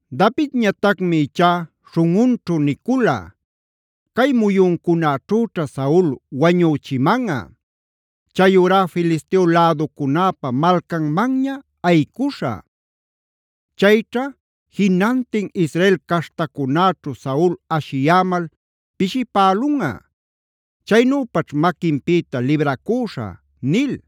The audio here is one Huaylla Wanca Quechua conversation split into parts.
Davidñatacmi ichá śhunꞌunćhu nicula: “Cay muyuncunaćhüćha Saul wañüchimanꞌa. Chayurá Filisteo läducunäpa malcanmanña ayicuśhä. Chayćha jinantin Israel caśhtacunäćhu Saul ashiyämal pishipälunꞌa. Chaynüpaćh maquinpïta libracüśhä” nil.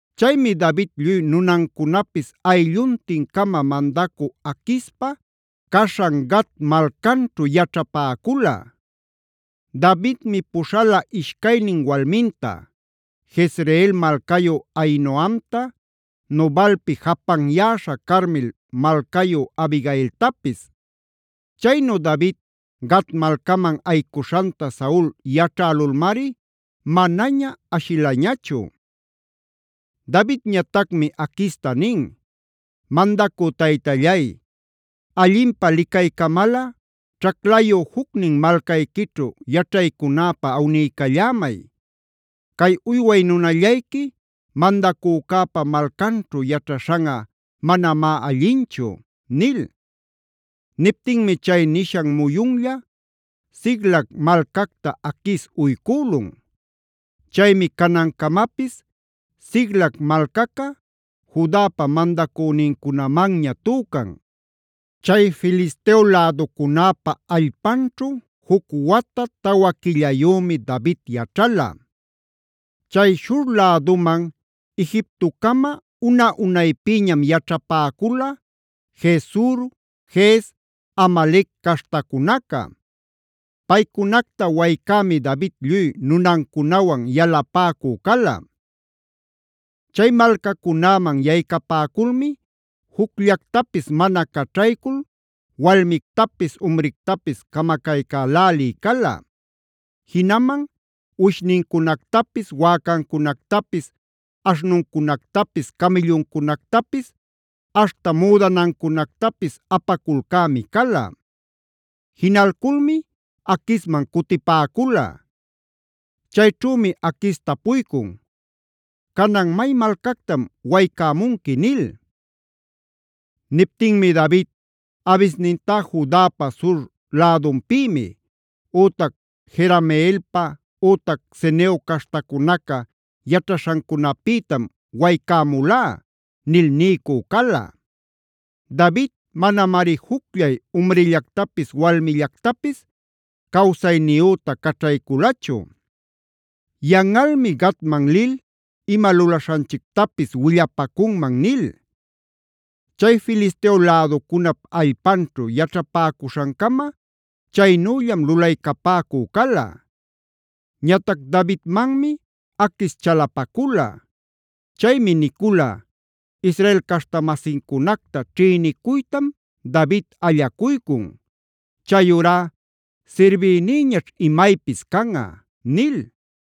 Chaymi David lluy nunancunapis aylluntin-cama mandacü Aquispa caśhan Gat malcanćhu yaćhapäcula. Davidmi puśhala ishcaynin walminta: Jezreel malcayu Ahinoamta, Nabalpi japanyäsha Carmel malcayu Abigailtapis. Chaynu David Gat malcaman ayicuśhanta Saul yaćhälulmari manaña ashilañachu. Davidñatacmi Aquista nin: “Mandacü taytallay, allinpä licaycamalꞌa ćhaclayu jucnin malcayquićhu yaćhaycunäpä awniycallämay. Cay uyway nunallayqui mandacücäpa malcanćhu yaćhaśhanꞌa manamá allinchu” nil. Niptinmi chay nishan muyunlla Siclag malcacta Aquis uycülun. Chaymi canancamapis Siclag malcaca Judapa mandacünincunamanña tücan. Chay Filisteo läducunäpa allpanćhu juc wata tawa quillayümi David yaćhala. Chay Shur läduman Egiptocama una-unaypïñam yaćhapäcula Gesur, Gez, Amalec caśhtacunaca. Paycunacta waycämi David lluy nunancunawan yalapäcu cala. Chay malcacunäman yaycapäculmi jucllactapis mana caćhaycul walmictapis umrictapis camacaycälälï cala. Jinaman uwishnincunactapis, wäcancunactapis, aśhnuncunactapis, camïlluncunactapis, aśhta müdanancunactapis apaculcämi cala. Jinalculmi Aquisman cutipäcula. Chayćhümi Aquis tapuycun: “¿Canan, may malcactam waycämunqui?” nil. Niptinmi David: “Abisnintá Judapa sur lädunpïmi, ütac Jerameelpa, ütac Ceneo caśhtacunaca yaćhaśhancunapïtam waycämulá” nil niycü cala. David manamari jucllay umrillactapis walmillactapis cawsayniyüta caćhayculachu: “Yanꞌalmi Gatman lil ima lulaśhanchictapis willapacunman” nil. Chay Filisteo läducunap allpanćhu yaćhapäcuśhancama chaynüllam lulaycapäcü cala. Ñatac Davidmanmi Aquis chalapacula. Chaymi nicula: “Israel caśhta-masincunacta ćhïnicuytam David allacuycun. Chayurá sirbïnïñaćh imaypis canꞌa” nil.